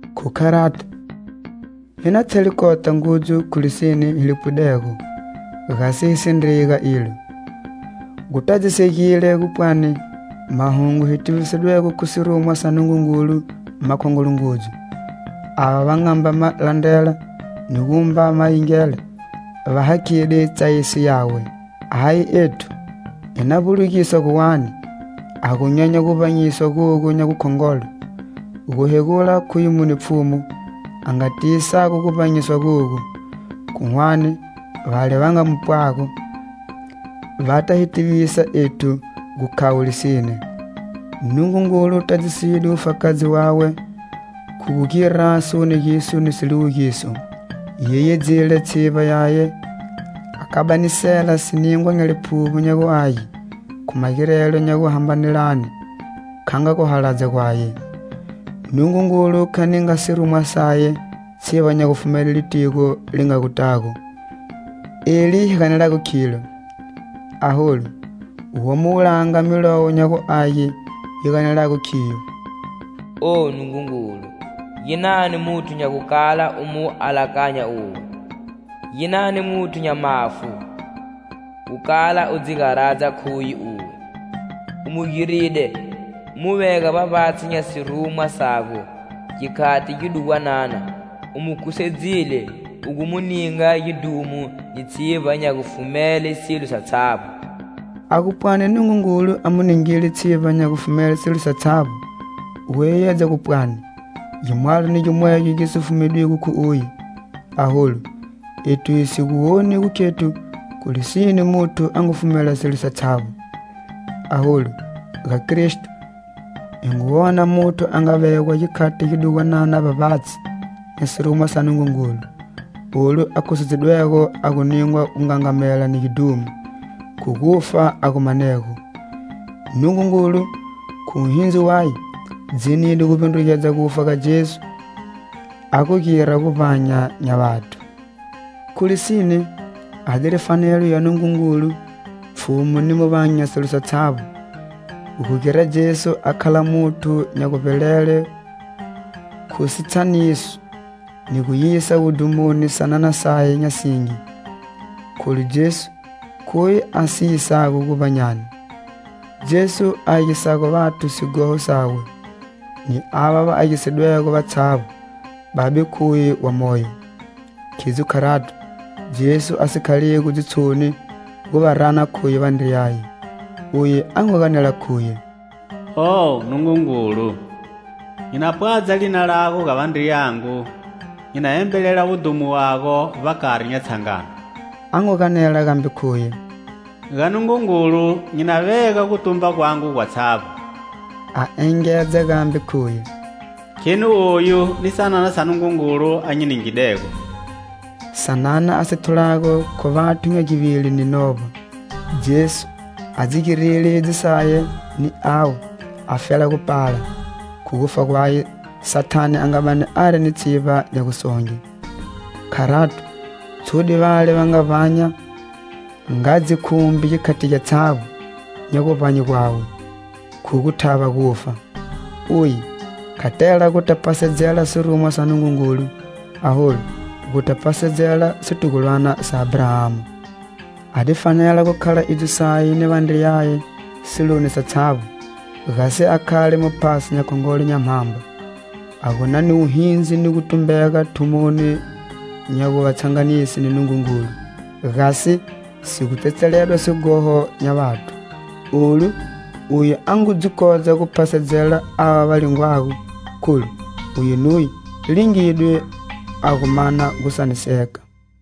Khu kharato, hi na thele kota ngudzu khu lisine hi li pwidego, gasi hi si ndreyi ga ilo. Gutadzisegile gupwani mahungu hi tivisidwego khu sirumwa sa Nungungulu makhongolo ngudzu; ava va nga mba ma landrela ni gumba ma yingela va hakhide tsayiso yawe. Ahi ethu, hi na vbulugisa guwani, ha gu nyenya guvbanyiswa gogu nya gukhongolo? Guhegula khuye mune Pfhumu a nga tivisago guvbanyiswa gogu. Khu hwane, vale va nga mu pwago, va ta hi tivisa ethu gu khavo lisine. Nungungulu tadziside wufakazi wawe khu gu gira siwoniso ni siliwugiso, yeyedzile tshivba yaye, a kabanisela siningwa nya Liphuvbo nya gu Age, khu magirelo nya guhambanelane, kha nga guhaladza gwaye. Nungungulu kha ninga sirumwa saye tshivba nya gufumele litigo li nga gutago, eli hi ganelago khilo. Aholu, womo wulanga Milowo nya gu Age yi ganelago khiyo: "Oh, Nungungulu, ginani muthu nya gukala u mu alakanya uwe? Ginani muthu nya mafu, gukala u dzi garadza khu uye? U mu giride, u mu vega vbavbatshi nya sirumwa sago gikhati gidugwanana, u mu khusedzile u gu mu ninga gidhumo ni tshivba nya gufumele silo satshavbo." A gu pwani Nungungulu a mu ningile "Tshivba nya gufumele silo satshavbo" gu yeyedza gu pwani gimwalo ni gimwegyo gi si fumedwigo khu uye. Aholu ethu hi si gu woni gu khethu khu lisine muthu a ngu fumela silo satshavbo. Aholu ga Kristo, hi ngu wona muthu a nga vegwa gikhati gidugwanana vbavbatshi nya sirumwa sa Nungungulu, olu a khusedzidwego a gu ningwa gungangamela ni gidhumo, khu gufa a gu manego. Nungungulu, khu wuhindzi waye, dzinide guvbindrugedza gufa ga Jesu a gu gira guvbanya nya vathu. Khu lisine, a diri fanelo ya Nungungulu, Pfhumu ni Muvangi nya silo satshavbo, gu gira Jesu a khala muthu nya guvbelele khu sitshaniso, ni gu yisa wudhumoni sanana saye nya singi, kholu Jesu khuye a si yisago guvbanyani. Jesu a agisago vathu sighoho sawe, ni ava va agisidwego vatshavbo Babe khuye wa moyo. Khidzo kharato, Jesu a si khaligo dzitshoni gu va rana khuye vandriyaye. Uye a ngu ganela khuye: "Oh, Nungungulu, nyi na pwadza lina lago ga vandriyangu nyi na embelela wudhumo wago vbakari nya tshangano." A ngu ganela gambe khuye: "Ga Nungungulu nyi na vega gutumba gwangu gwatshavbo." A engedza gambe khuye: "Kheni oyu ni sanana Nungungulu a nyi ningidego." Sanana a si thulago khu vathu nya givili ni novba. Jesu a dzi girile idzo saye ni avo afela gu pala, khu gufa gwaye, Sathane a nga bani ari ni tshivba nya gusonge. Kharato, tshude vale va nga vbanya nga dzikhumbi gikhati gyatshavbo nya guvbanye gwawe, khu gu thava gufa. Uye kha tela guta phasedzela sirumwa sa Nungungulu, aholu, guta phasedzela situgulwana sa Abrahama. A di fanela gu khala idzo saye ni vandriyaye siloni satshavbo, gasi a khale Muphasi nya Khongolo nya mhamba, a gu na ni wuhindzi ni gutumbega thumoni nya gu va tshanganise ni Nungungulu, gasi si gu tsetseledwa sighoho nya vathu. Olu, uye a ngu dzi kodza gu phasedzela ava va lingwago, kholu uye nuye lingidwe a gu mana gusaniseka.